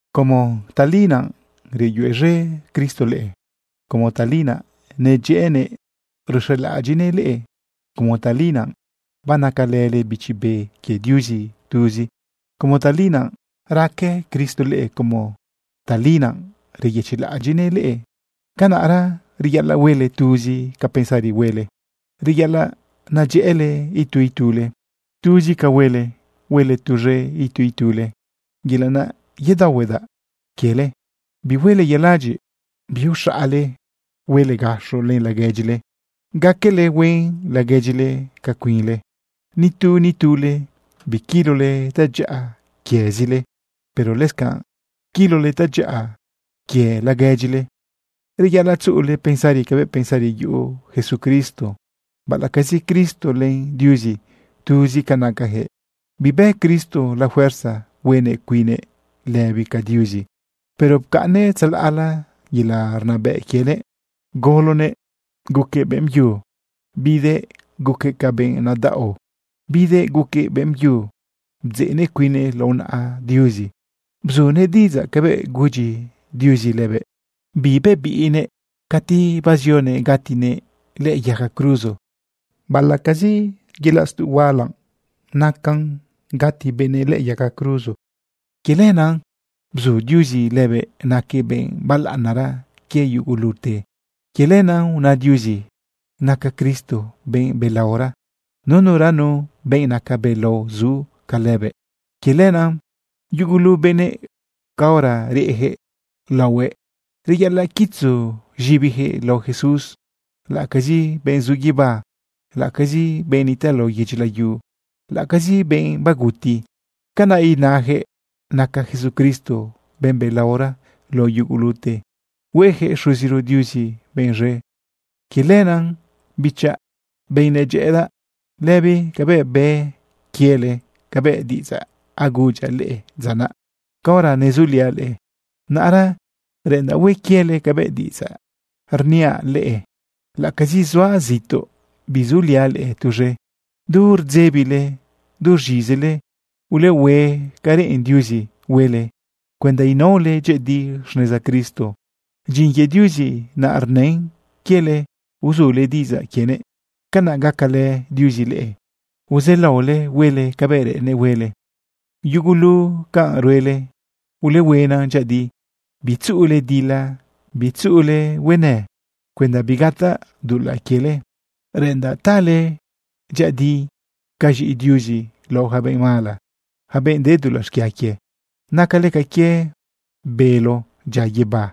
Como tali naꞌ reyuez̃e Cristo leꞌe, como tali naꞌ nadyëꞌënëꞌ ruxelaꞌadyiꞌnëꞌ leꞌe, como tali naꞌ banacalële Bichi Be quie Diuzi tuzi, como tali naꞌ raque Cristo leꞌe, como tali naꞌ reyëchiꞌlaꞌadyiꞌnëꞌ leꞌe, canaꞌra reyaꞌalaꞌ huele tuzi ca pensari huele. Reyaꞌalaꞌ nadyëꞌële itu itule. Tuzi ca huele, huele tuz̃e itu itule. Yelaꞌ naꞌ yedaohuedaꞌ quiele. Bihuele yaladyiꞌ, biuxaꞌale. Huele gaxo len laguedyile, gaquele huen laguedyile ca cuinle. Nitu nitule biquilole tadyaꞌa quiezile, pero lëscanꞌ quilole tadyaꞌa quie laguedyile. Reyaꞌalaꞌ tzuꞌule pensari cabëꞌ pensari yuꞌu Jesucristo. Baꞌalaꞌcazi Cristo len Diuzi tuzi ca nacayaquëꞌ, bibë Cristo la fuerza huenëꞌ cuinnëꞌ lëbi ca Diuzi, pero pcaꞌnnëꞌ tzalaꞌla yelaꞌ rnabëꞌ quienëꞌ, gologuëꞌ guquëꞌ beꞌmbyu, bidëꞌ guquëꞌ ca benꞌ nadaꞌo. Bidëꞌ guquëꞌ beꞌmbyu bdzeꞌnëꞌ cuinnëꞌ lao naꞌa Diuzi. Bzunëꞌ diꞌidzaꞌ cabëꞌ gudyi Diuzi lëbëꞌ. Bibebiꞌnëꞌ cati bazionëꞌ gatinëꞌ lëꞌë yaga cruzo, baꞌalaꞌcazi yelaꞌ stuꞌ huala naꞌ gati benëꞌ lëꞌë yaga cruzo. Quie lenaꞌ bzu Diuzi lëbëꞌ naquëꞌ benꞌ balaꞌanara quie yugulute. Quie lenaꞌ una Diuzi naca Cristo benꞌ belaora, nuranu benꞌ naca belao zu ca lëbëꞌ. Quie lenaꞌ yugulu benëꞌ, caora reyaquëꞌ laohuëꞌ, reyaꞌalaꞌ quitzu z̃ibiyaquëꞌ lao Jesús, laꞌacazi benꞌ zu guibá, laꞌacazi benꞌ nitaꞌ lao yedyi layu, laꞌacazi benꞌ baguti. Canaꞌ inayaquëꞌ naca Jesucristo benꞌ belaora lao yugulute, hueyaquëꞌ Xuziro Diuzi benꞌ z̃e. Quie lenaꞌ, bichaꞌ, benꞌ nedyëꞌëdaꞌ, lëbi cabëꞌ bë quiele cabëꞌ diꞌidzaꞌ agudyaꞌ leꞌe dza naꞌ caora nezuliaꞌ leꞌe, naꞌra reꞌendaꞌ hue quiele cabëꞌ diꞌidzaꞌ riaꞌ leꞌe, laꞌacazi zuaꞌ zituꞌ bisuliaꞌ leꞌe tuz̃e. Du rdzebile, du rz̃izile ulehue ca reꞌen Diuzi huele cuenda inaole dyëꞌëdi xneza Cristo. Dyin quie Diuzi naꞌ rnën quiele uzule diꞌidzaꞌ quienëꞌ. Canaꞌ gacalë Diuzi leꞌe uzaꞌlaole huele cabëꞌ reꞌennëꞌ huele. Yugulu canꞌ ruele, ulehuena dyëꞌëdi. Bitzuꞌule dila, bitzuꞌule huenë, cuenda bigataꞌ dulaꞌ quiele. Reꞌendaꞌ tale dyëꞌëdi ca z̃iꞌi Diuzi lao yaca benꞌ mala, yaca benꞌ de dulaꞌ xquia quie. Nacale ca quie bélo dyia guibá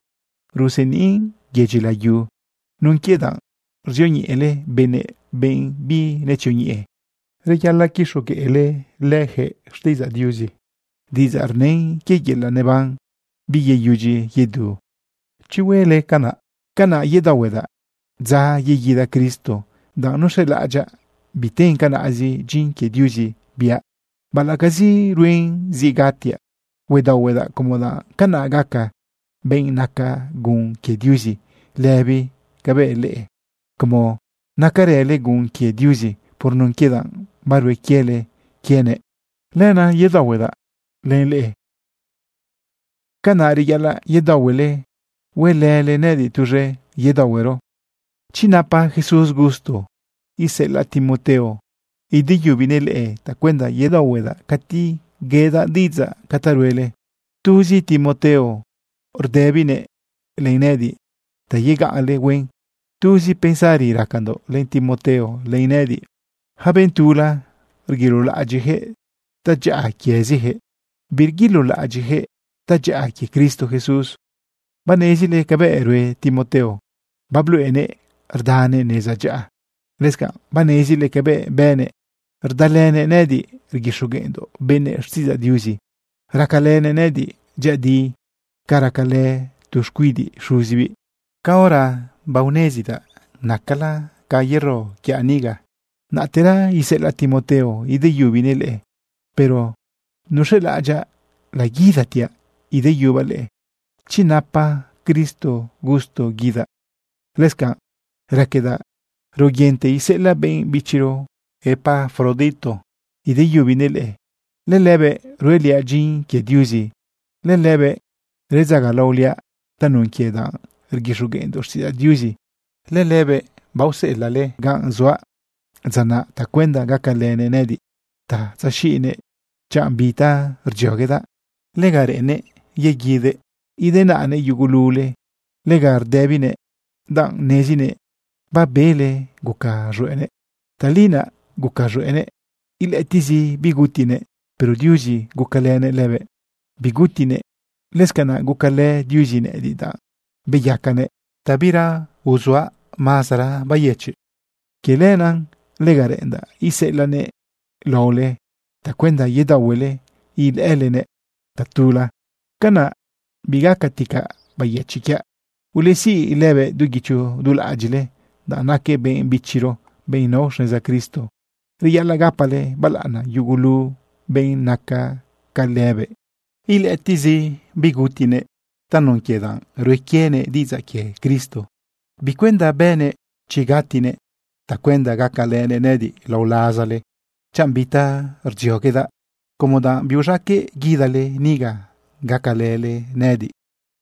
ruseniꞌn yedyi layu nun quie danꞌ ruzioñeꞌele benëꞌ, benꞌ binetzioñeꞌe. Reyaꞌalaꞌ quixogueꞌleyaquëꞌ xtiꞌidzaꞌ Diuzi, diꞌidzaꞌ rnën quie yelaꞌ neban biyeyudyi yedu. Chi huele canaꞌ, canaꞌ yedaohuedaꞌ dza yeguida Cristo danꞌ nuz̃elaꞌadyaꞌ biten canaꞌzi dyin quie Diuzi biaꞌ. Baꞌalaꞌcazi ruen zi gatiaꞌ, huedaohuedaꞌ como danꞌ canaꞌ gacaꞌ benꞌ naca gun quie Diuzi lëbi cabëꞌ leꞌe, como nacarële gun quie Diuzi por nun quie danꞌ barue quiele quienëꞌ. Lenaꞌ yedaohuedaꞌ len leꞌe. Canaꞌ reyaꞌalaꞌ yedaohuele huelële nëꞌëdiꞌ tuz̃e yedaohuero. Chi napa Jesús gusto, iseꞌelaꞌ Timoteo ideyubinëꞌ leꞌe tacuenda yedaohuedaꞌ cati yedaꞌ diꞌidzaꞌ ca ta ruele. Tuzi Timoteo rdëbinëꞌ len nëꞌëdiꞌ ta yegaꞌnle huen. Tuzi pensari racandoꞌ len Timoteo len nëꞌëdiꞌ. Yaca benꞌ tula, rguilolaꞌadyiꞌyaquëꞌ tadyaꞌa quieziyaquëꞌ, birguilolaꞌadyiꞌyaquëꞌ tadyaꞌa quie Cristo Jesús. Banezile cabëꞌ rue Timoteo. Babluꞌenëꞌ rdanëꞌ neza dyaꞌa. Lëscanꞌ banezile cabëꞌ bënëꞌ rdalënëꞌ nëꞌëdiꞌ rguixogueꞌndoꞌ benëꞌ xtiꞌidzaꞌ Diuzi. Racalënëꞌ nëꞌëdiꞌ dyëꞌëdi ca racalë tu xcuidiꞌ xuzibiꞌ. Caora banezdaꞌ nacala ca yero quiaꞌ niga, naꞌtera iseꞌelaꞌ Timoteo ideyubinëꞌ leꞌe. Pero nuz̃elaꞌadyaꞌ laguidatiaꞌ ideyubaꞌ leꞌe, chi napa Cristo gusto guidaꞌ. Lëscanꞌ raquedaꞌ raoyente iseꞌelaꞌ benꞌ bichiro Epafrodito ideyubinëꞌ leꞌe. Lëlëbëꞌ rueliaꞌ dyin quie Diuzi, lëlëbëꞌ redzagalaoliaꞌ tanun quie danꞌ rguixogueꞌndoꞌ xtiꞌidzaꞌ Diuzi. Lëlëbëꞌ baoseꞌelaꞌle ganꞌ zuaꞌ dza naꞌ tacuenda gacalënëꞌ nëꞌëdiꞌ ta tzaxiꞌnëꞌ chanꞌ bi ta rdzioguedaꞌ. Lega reꞌennëꞌ yeguidëꞌ idenaꞌnëꞌ yugulule. Lega rdëbinëꞌ danꞌ nezinëꞌ babele guca z̃hueꞌnëꞌ. Tali naꞌ guca z̃hueꞌnëꞌ ilëꞌëtiꞌzi bigutinëꞌ. Pero Diuzi gucalënëꞌ lëbëꞌ, bigutinëꞌ. Lëscanaꞌ gucalë Diuzi nëꞌëdiꞌ, danꞌ beyacanëꞌ ta bira uzuaꞌ mazara bayëchiꞌ. Quie lenaꞌ lega reꞌendaꞌ iseꞌelaꞌnëꞌ laole tacuenda yedaohuele ilëꞌëlenëꞌ tatula. Canaꞌ bigacatica bayëchiꞌ quiaꞌ. Ulesiꞌ lëbëꞌ du guicho du laꞌadyiꞌle, danꞌ naquëꞌ benꞌ bichiro, benꞌ nao xneza Cristo. Reyaꞌalaꞌ gapale balaꞌana yugulu benꞌ naca ca lëbëꞌ. Ilëꞌëtiꞌzi bigutinëꞌ tanun quie danꞌ rue quienëꞌ diꞌidzaꞌ quie Cristo. Bicuenda bënëꞌ chi gatinëꞌ tacuenda gacalënëꞌ nëꞌëdiꞌ lao lazale chanꞌ bi ta rdzioguedaꞌ, como danꞌ biuz̃aqueꞌ guidale niga gacalële nëꞌëdiꞌ.